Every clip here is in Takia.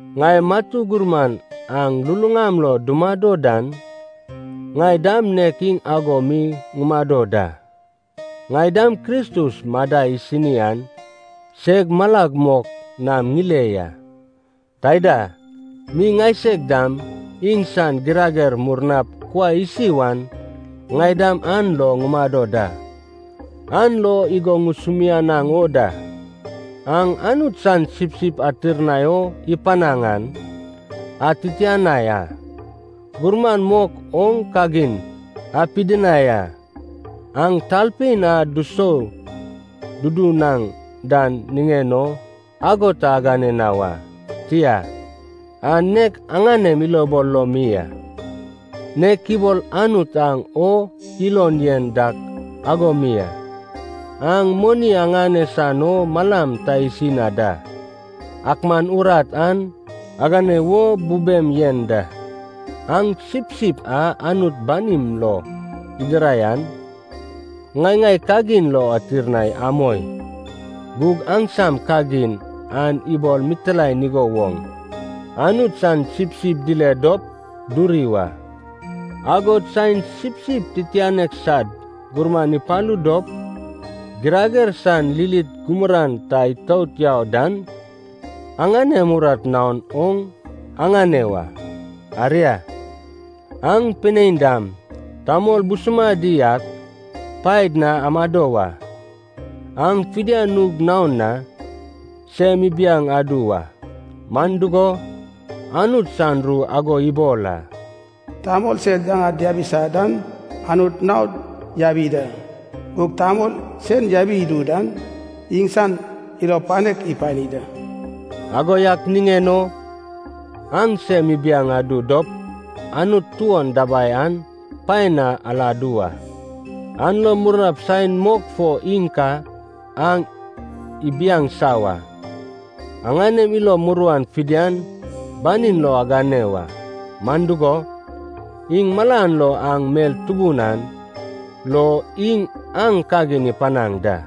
Ŋai matu gurman aŋ luluŋam lo dumado dan, ŋai dam nek iŋ ago mi ŋumado da. Ŋai dam Kristus madai isini an seg malag mok nam ŋile ya. Taida mi ŋaiseg dam iŋsan girager murnap kuai isi wan ŋai dam an lo ŋumado da. An lo igo ŋusumianaŋ o da. Aŋ Anut san sipsip atirnai o ipanaŋ an atitianai a. Gurman mok oŋ kagin apidinai a, aŋ talpein a dusou dudunaŋ dan niŋen o ago ta agane na wa, tia, an nek aŋanem ilobol lo mi a, nek ibol Anut aŋ o ilon yen dak ago mi a. Aŋ moni aŋane san o malam ta isi na da, ak man urat an agane wo bubem yen da. Aŋ sipsip a Anut banim lo idirai an ŋai-ŋai kagin lo atirnai amoi. Gug aŋsam kagin an ibol mitilaen igo woŋ Anut san sipsip dile dop duri wa. Agod saen sipsip titianek sad gurman ipalu dop, girager san lilit gumuran ta itout yau dan aŋanem urat naon oŋ aŋane wa. Aria, aŋ pinein dam tamol busumadi ak paed na amado wa. Aŋ fidian nug naon na sem ibiaŋ adu wa. Man dugo, Anut san ru ago ibol a, “Tamol sed yaŋad diabisa dan Anut naod yabi da. Gug tamol sen yabi idu dan iŋsan ilo panek ipani da.” Ago yak niŋen o aŋ sem ibiaŋ adu dop Anut tuon dabai an paen na aladu wa. An lo murnap saen mok fo iŋ ka aŋ ibiaŋsa wa. Aŋanem ilo muruan fidian banin lo agane wa. Man dugo, iŋ malan lo aŋ mel tubun an lo iŋ aŋ kagin ipanaŋ da.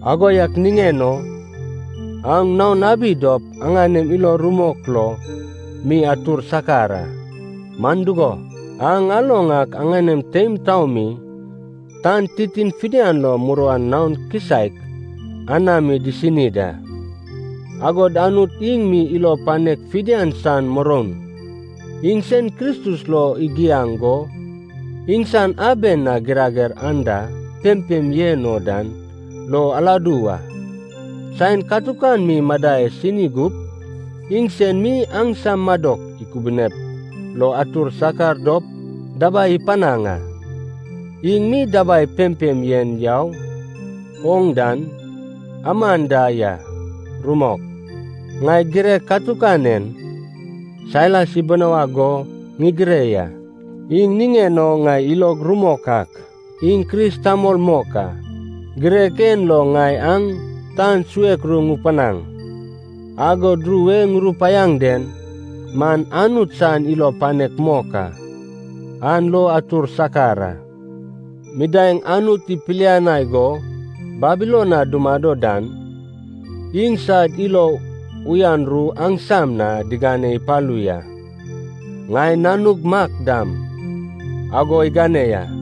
Ago yak niŋen o aŋ naon abi dop aŋanem ilo rumok lo mi atur sakar a. Man dugo, aŋ aloŋ ak aŋanem teim taomi tan titin fidian lo muruan naon kisaek anami disini da. Agod Anut iŋ mi ilo panek fidian san muroun, iŋsen Kristus lo igiaŋ go iŋsan aben a girager anda pempem yen oŋ dan lo aladu wa. Saen katukan mi madai asini gup iŋsen mi aŋsam madok ikubunep lo atur sakar dop dabai ipanaŋ a. Iŋ mi dabai pempem yen yau oŋ dan aman da ya. Rumok. Ŋai girek katukan en Sailas ibinawag go ŋigire ya. Iŋ niŋen o ŋai ilog rumok ak, iŋ Kris tamol mok a. Girek en lo ŋai aŋ tan suek ru ŋupanaŋ, agod ru e ŋurupaiaŋ den man Anut san ilo panek mok a. An lo atur sakar a. Midaeŋ Anut ipilianai go Babilon na dumado dan iŋsad ilo uyan ru aŋsam na digane ipalu ya. Ŋai nanug Mak dam ago igane ya.